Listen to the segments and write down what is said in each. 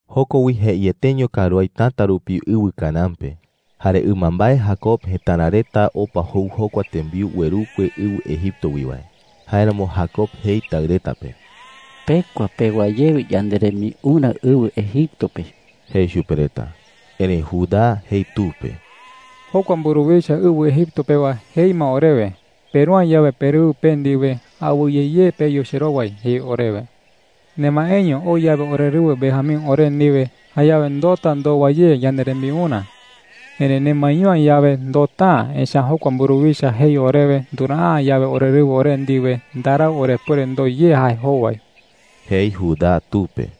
Joko wi jeieteño karuái täta rupi ɨwɨ Canaán pe. Jare ɨmambae Jacob jëtara reta opa jou jokua tembiu uerukue ɨwɨ Egipto wi wae. Jáeramo Jacob jei taɨ reta pe: “Pekua pewa ye yanderembiurä ɨwɨ Egipto pe,” jei chupe reta. Erëi Judá jei tu pe: “Jokua mburuwicha ɨwɨ Egipto pewa jei ma orewe: ‘Peru’ä yawe perɨwɨ pe ndiwe, awɨye ye peyu cherowai,’ jei orewe,” jei. “Nemaeño oo yawe orerɨwɨ Benjamín ore ndiwe, jayawe ndoota ndowa ye yanderembiurä. Erëi nemaeño’ä yawe, ndoota’ä. Echa’ä jokua mburuwicha jei orewe nduraa’ä yawe orerɨwɨ ore ndiwe, ndarau orepuere ndoo ye jae jowai,” jei Judá tu pe.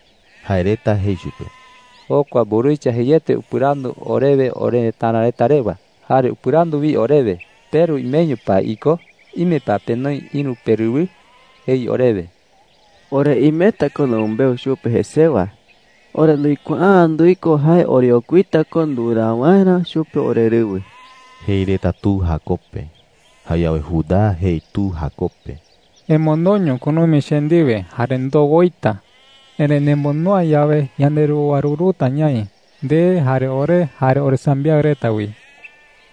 Jae reta jei chupe: “Jokua mburuwicha jeiete upɨrandu orewe orerëtara reta rewa. Jare upɨrandu wi orewe: “¿Peru imeño pa iko? ¿Ime pa penoi ïru perɨwɨ?’ jei orewe,” jei reta chupe. “Ore imeta ko numɨmbeu chupe jesewa. Ore nduikuaa’ä nduiko jae oreokuita ko nduraa waerä chupe orerɨwɨ,” jei reta tu Jacob pe. Jayawe Judá jei tu Jacob pe: “Emondoño kunumi che ndiwe jare ndoo woita,” jei. “Erëi nemondo’ä yawe, yanderowaruruta ñaï – nde, jare ore, jare oresambiaɨ reta wi,” jei.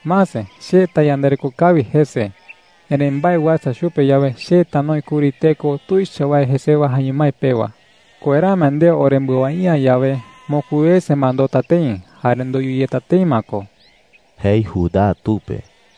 “Mase, che tayandareko kawi jese. Erëi mbae uasa chupe yawe, che tanoi kuri teko tuicha wae jesewa jaeño mái pewa,” jei. “¡Kuerae ma nde orembɨawai’ä yawe, mokui wese ma ndoota tëi jare ndoyu yeta tëi ma ko!” jei Judá tu pe.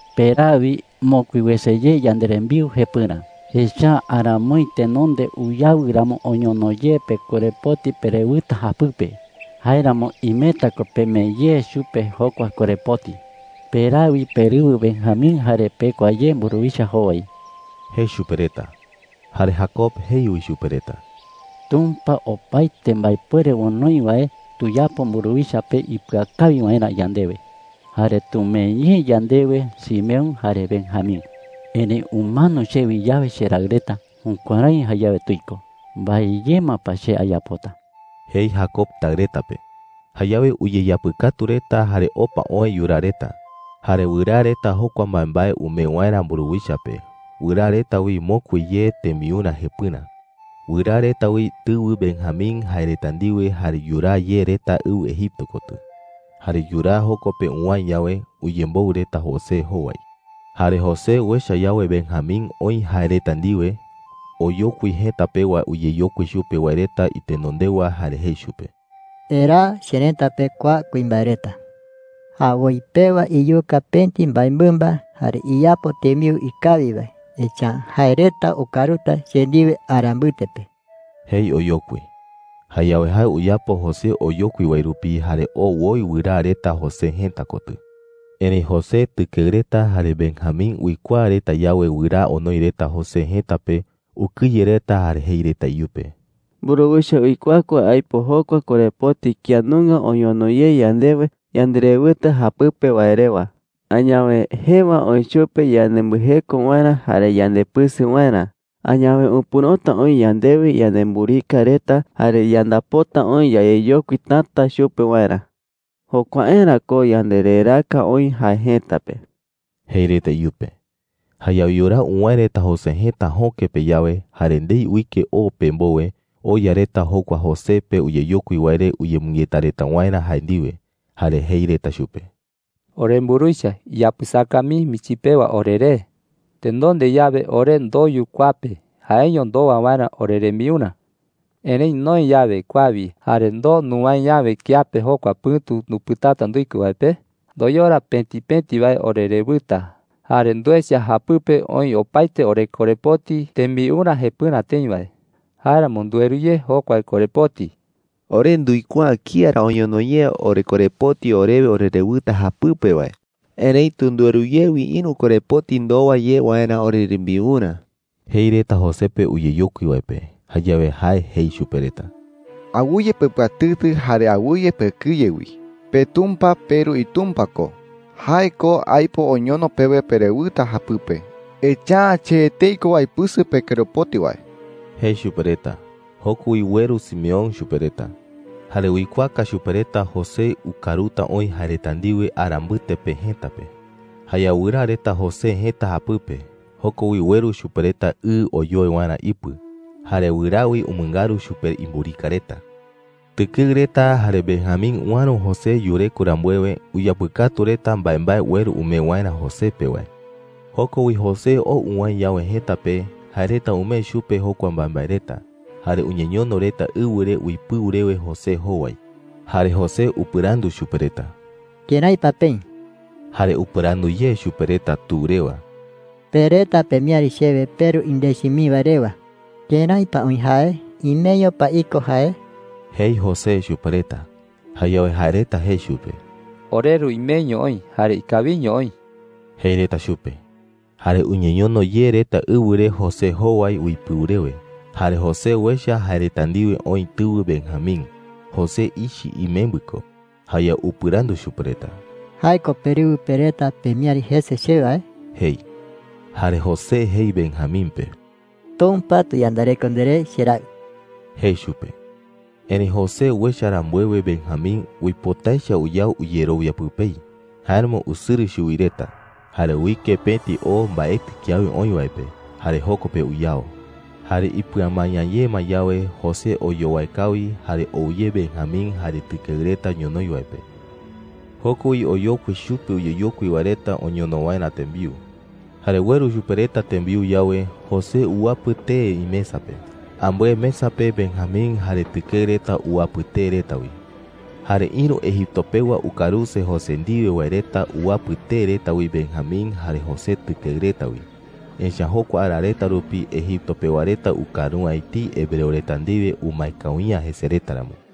“Peraa wi mokui wese ye yanderembiu jepɨrä, echa’ä aramoi tenonde uyawɨ ramo oñono ye pekorepoti perewɨta japɨpe. Jáeramo imeta ko pemee ye chupe jokua korepoti,” jei. “Peraa wi perɨwɨ Benjamín jare pekua ye mburuwicha jowai,” jei chupe reta. Jare Jacob jei wi chupe reta: “Tumpa opaete mbaepuere onoi wae tuyapo mburuwicha pe ipɨakawi waerä yandewe, jare tumee ye yandewe Simeón jare Benjamín. Erëi umano chewi yawe cheraɨ reta, jukuärái jayawe tuiko. ¿Mbae ye ma pa che ayapota?” jei Jacob taɨ reta pe. Jayawe uyeyapɨkatu reta jare opa oë yuraa reta. Jare wɨraa reta jokua mbaembae umee waerä mburuwicha pe. Wɨraa reta wi mokui ye tembiurä jepɨrä. Wɨraa reta wi tɨwɨ Benjamín jae reta ndiwe jare yuraa ye reta ɨwɨ Egipto kotɨ. Jare yuraa joko pe uwäe yawe, uyemboɨ reta José jowai. Jare José uecha yawe Benjamín oï jae reta ndiwe, oyokui jëta pewa uyeyokui chupe wae reta itenondewa jare jei chupe: “Eraa cherëta pe kua kuimbae reta,” jei. “Jawoi pewa iyuka pëti mbaemɨmba jare iyapo tembiu ikawi wae. Echa’ä jae reta ukaruta che ndiwe ara mbɨte pe,” jei oyokui. Jayawe jae uyapo José oyokui wae rupi jare oo woi wɨraa reta José jëta kotɨ. Erëi José tɨkeɨ reta jare Benjamín uikuaa reta yawe wɨraa onoi reta José jëta pe, ukɨye reta jare jei reta iyupe: “Mburuwicha uikuaa ko aipo jokua korepoti kía nunga oñono ye yandewe yanderewɨta japɨpe wae rewa. Añawe jëwa oï chupe yanembɨjeko waerä jare yandepɨsɨ waerä. Añawe upɨ̈rota oï yandewi yanemburika reta, jare yandapota oï yayeyokui täta chupe waerä. Jokuaerä ko yandereraaka oï jae jëta pe,” jei reta iyupe. Jayawe yuraa uwäe reta José jëta jöke pe yawe, jare ndei uike o pe mbowe, oya reta jokua José pe uyeyokui wae re uyemɨngeta reta waerä jae ndiwe. Jare jei reta chupe: “Oremburuwicha, iyapɨsaka mii michi pewa oreré,” jei reta. “Tenonde yawe, ore ndoyu kua pe jaeño ndowa waerä orerembiurä. Erëi noë yawe kua wi, jare ndoo nuwäe yawe kiape jokua pɨ̈tu ndupɨtata nduiko wae pe, ndoyora pëti pëti wae orerewɨta. Jare nduecha japɨpe oï opaete orekorepoti tembiurä jepɨrä tëi wae. Jáeramo ndueru ye jokua korepoti,” jei reta. “Ore nduikuaa’ä kía ra oñono ye orekorepoti orewe orerewɨta japɨpe wae. Erëitu ndueru ye wi ïru korepoti ndowa ye waerä orerembiurä,” jei reta José pe uyeyokui wae pe. Jayawe jae jei chupe reta: “Awɨye pepɨatɨtɨ jare awɨye pekɨye wi,” jei. “PeTumpa – peru iTumpa ko – jae ko aipo oñono pewe perewɨta japɨpe. Echa’ä che etei ko aipɨsɨ pekorepoti wae,” jei chupe reta. Joko wi ueru Simeón chupe reta. Jare uikuaaka chupe reta José ukaruta oï jae reta ndiwe ara mbɨte pe jëta pe. Jayawe wɨraa reta José jëta japɨpe. Joko wi ueru chupe reta ɨ oyoe waerä ipɨ. Jare wɨraa wi umɨngaru chupe imburika reta. Tɨkeɨ reta jare Benjamín uäro José yureko rambuewe, uyapɨkatu reta mbaembae ueru umee waerä José pe wae. Joko wi José ou uwäe yawe jëta pe, jae reta umee chupe jokua mbaembae reta, jare uñeñono reta ɨwɨ re uipɨu rewe José jowai. Jare José upɨrandu chupe reta: “¿Kërái pa peï?” Jare upɨrandu ye chupe reta tu rewa: “Pe reta pemiäri chewe peru indechi mii wae rewa. ¿Kërái pa oï jae? ¿Imeño pa iko jae?” jei José chupe reta. Jayawe jae reta jei chupe: “Oreru imeño oï jare ikawiño oï,” jei reta chupe. Jare uñeñono ye reta ɨwɨ re José jowai uipɨu rewe. Jare José uecha jae reta ndiwe oï tɨwɨ Benjamín – José ichɨ imembɨ ko. Jayawe upɨrandu chupe reta: “¿Jae ko perɨwɨ pe reta pemiäri jese chewe wae?” jei. Jare José jei Benjamín pe: “Tumpa tuyandareko nderé, cheraɨ,” jei chupe. Erëi José uecha rambuewe Benjamín, uipota echa uyao uyerowia pɨpei. Jáeramo usɨrɨ chuwi reta, jare uike pëti o mbaetɨ kiawe oï wae pe, jare joko pe uyao. Jare ipɨamaña ye ma yawe, José oyowae kawi, jare ou ye Benjamín jare tɨkeɨ reta ñonoï wae pe. Joko wi oyokui chupe uyeyokui wae reta oñono waerä tembiu. Jare ueru chupe reta tembiu yawe, José uwapɨ tee imesa pe. Ambɨe mesa pe Benjamín jare tɨkeɨ reta uwapɨ tee reta wi. Jare ïru Egipto pewa ukaruse José ndiwe wae reta uwapɨ tee reta wi Benjamín jare José tɨkeɨ reta wi. Echa’ä jokua ara reta rupi Egipto pewa reta ukaru’ä etei hebreo reta ndiwe umae kawi’ä jese reta ramo.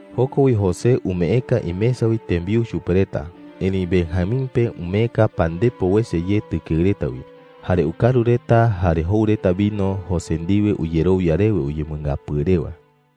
Joko wi José umeeka imesa wi tembiu chupe reta, erëi Benjamín pe umeeka pandepo wese ye tɨkeɨ reta wi. Jare ukaru reta jare jou reta vino José ndiwe uyerowia rewe uyemɨngapɨɨ rewa.